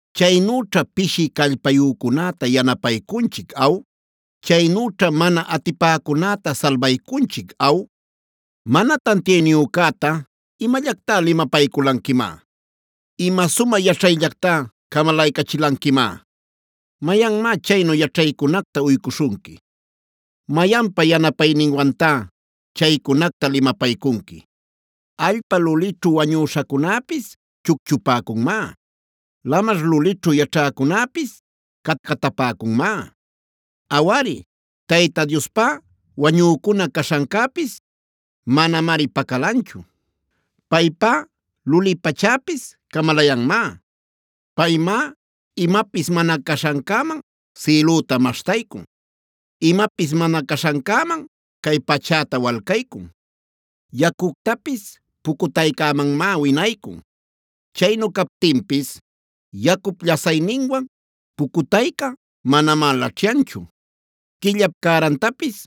“¿Chaynüćhá pishi callpayücunäta yanapaycunchic aw? ¿Chaynüćhá mana atipäcunäta salbaycunchic aw? ¿Mana tantiayniyücäta imallactá limapayculanquimá? ¿Ima sumä yaćhayllactá camalaycachilanquimá? ¿Mayanmá chaynu yaćhaycunacta uycuśhunqui? ¿Mayanpa yanapayninwantá chaycunacta limapaycunqui? “Allpa lulićhu wañüśhacunäpis chucchupäcunmá; lamar lulićhu yaćhäcunäpis catcatapäcunmá. Awari, Tayta Diospá wañücuna caśhancäpis, manamari pacalanchu. Paypá luli pachäpis camalayanmá. Paymá imapis mana caśhancäman sïlüta maśhtaycun; imapis mana caśhancäman cay pachäta walcaycun. Yacuctapis pucutaycämanmá winaycun; chaynu captinpis yacup llasayninwan pucutayca manamá laćhyanchu. Quillapa cärantapis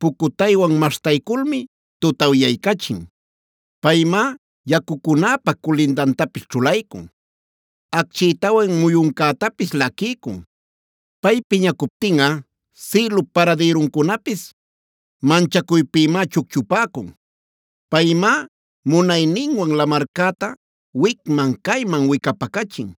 pucutaywan maśhtayculmi tutawyaycachin. Paymá yacucunäpa culindantapis ćhulaycun, acchïtawan muyuncätapis laquiycun. Pay piñacuptinꞌa sïlup paradïruncunapis manchacuypïmá chucchupäcun. Paymá munayninwan lamarcäta wicman-cayman wicapacachin.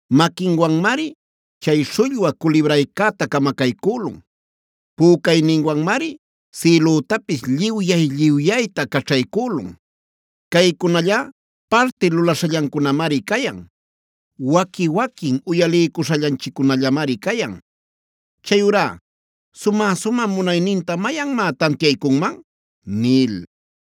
Maquinwanmari chay śhullwä culibraycäta camacaycülun; pücayninwanmari sïlütapis lliwyay-lliwyayta caćhaycülun. Caycunallá parti lulaśhallancunamari cayan; waqui-waquin uyaliycuśhallanchiccunallamari cayan. Chayurá ¿sumä-sumä munayninta mayanmá tantiaycunman?” nil.